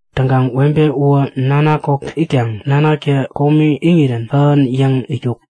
Täŋkaŋ webe uwä nanak kok itkaŋ nanaktä komi iŋirän kähän yäŋ itkuk.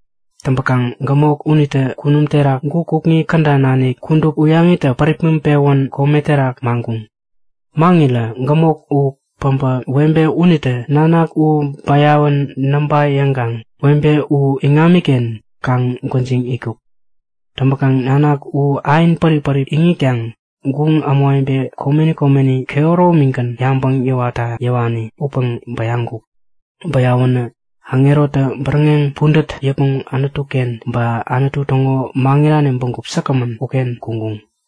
Täŋpäkaŋ gämok unitä kunum terak guk kukŋi käda nanik kudup uyaŋitä päripmäŋ-pewän kome terak maŋkuŋ. Maŋirä gämok u päbä webe unitä nanak u bäyawän näŋpa yäŋkaŋ webe u iŋamiken kaŋ-gwäjiŋ itkuk. Täŋpäkaŋ nanak u ain pärip-pärip iŋitkaŋ guŋ ämawebe komeni komeni kehäromigän yabäŋ yäwarekta yäwani upäŋ bäyaŋkuk. Bäyawänä aŋerotä bäräŋeŋ pudät yäpmäŋ Anutu-ken ba Anutu täŋo maŋirani bägup säkgämän uken kuŋkuŋ.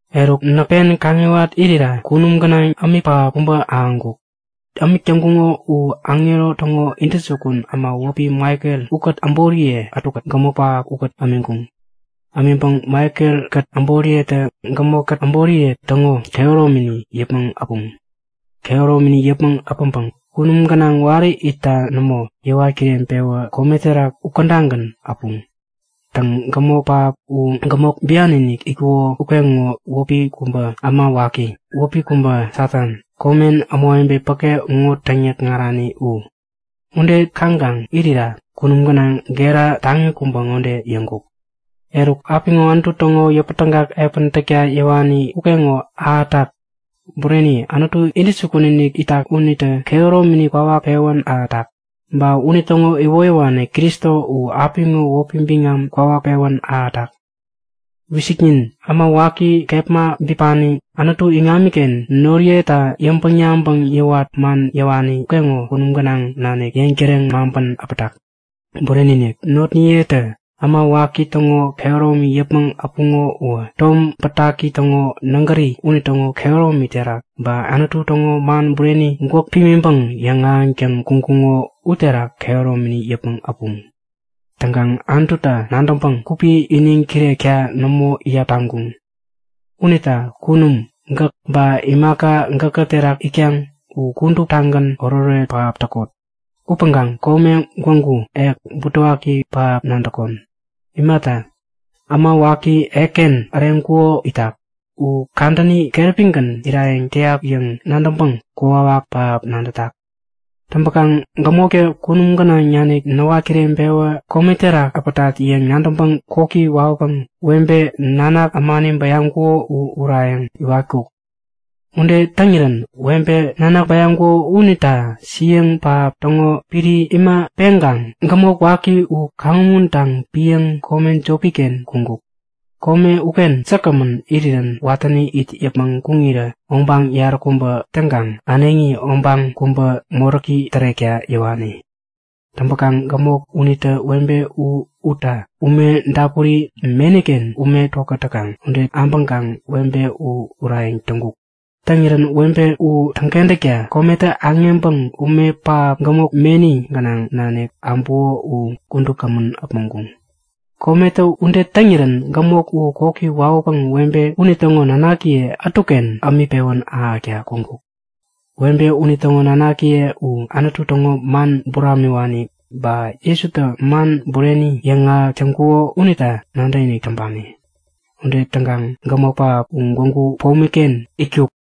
Eruk näk pen kaŋiwat irira kunum gänaŋ ämik pähap kubä ahäŋkuk. Ämik täŋkuŋo u aŋero täŋo intäjukun äma wäpi Maikel ukät äboriye ätukät gämok pähap ukät ämiŋkuŋ. Ämiŋpäŋ Maikelkät äboriyetä gämok-kät äboriye täŋo kehäromini yäpmäŋ äpuŋ. Kehäromini yäpmäŋ äpäŋpäŋ kunum gänaŋ wari itta nämo, yäwat kireŋpewä kome terak ukädagän äpuŋ. Täŋ, gämok pähap uwä gämok bian-inik itkuko ukeŋo wäpi kubä äma waki, wäpi kubä Satan, komen ämawebe päke ŋo täŋyäkŋarani u. Ude kaŋkaŋ irira kunum gänaŋ gera taŋi kubä ŋode yäŋkuk; Eruk apiŋo Anutu täŋo yäpätägak epän täkta yäwani ukeŋo ahätak. Bureni, Anutu intäjukun-inik itak unitä kehäromini kwawak pewän ahätak. Ba unitäŋo iwoyäwani Kristo u apiŋo wäpi biŋam kwawak pewän ahätak. Wisiknin! Äma waki kepma bipani Anutu iŋamiken notniyeta yäŋpäŋ-yabäŋ yäwat man yäwani ukeŋo kunum gänaŋ nanik yeŋtäreŋ maŋpän äpmotak. Bureni-inik! Notniyetä äma waki täŋo kehäromi yäpmäŋ äpuŋo uwä, Tom Bätaki täŋo nägäri unitäŋo kehäromi terak, ba Anutu täŋo man bureni, gwäk pimiŋpäŋ yäŋahäŋtäŋ kuŋkuŋo uterak kehäromini yäpmäŋ äpuŋ. Täŋkaŋ Anututa nadäŋpäŋ gupi iniŋ kirekta nämo iyap taŋkuŋ. Unita kunum gäk, ba imaka gäkä terak itkaŋ u kuduptagän oretoret pähap nadäkot! Upäŋkaŋ kome gwägu, ek butewaki pähap nadäkon! Imata, äma waki, ekken äreŋkuko itak. U kadäni keräpigän irayäŋ täyat yäŋ nadäŋpäŋ kokwawak pähap nadätak! Täŋpäkaŋ gämoktä kunum gänaŋ nanik näwat kireŋpewä kome terak äpätat yäŋ nadäŋpäŋ koki wawäpäŋ webe, nanak ämani bäyaŋkuko u urayäŋ iwatkuk. Ude täŋirän webe nanak bäyaŋkuko unita siäŋ pähap täŋo piri imä peŋkaŋ gämok waki u kaŋumuntaŋ piäŋ kome jopi-ken kuŋkuk. Kome uken säkgämän irirän watäni it yäpmäŋ kuŋirä obaŋ yaräkubä täŋkaŋ äneŋi obaŋ kubä moräki tärekta yäwani. Täŋpäkaŋ gämok unitä webe u utta ume dapuri meni-ken ume tokät täkaŋ ude abäŋkaŋ webe u urayäŋ täŋkuk. Täŋirän webe u täŋkentäkta kometä aŋeŋpäŋ ume pähap, gämok meni gänaŋ nanik äbuko u kudup kämän äpmoŋkuŋ. Kometä ude täŋirän gämok u koki wawäpäŋ webe unitäŋo nanakiye ätuken ämik pewän ahäkta kuŋkuk. Webe unitäŋo nanakiye u Anutu täŋo man buramiwani ba Jesutä man bureni yäŋahäk täŋkuko unita nadäkinik täŋpani. Ude täŋkaŋ gämok pähap u gwägu pomi-ken itkuk.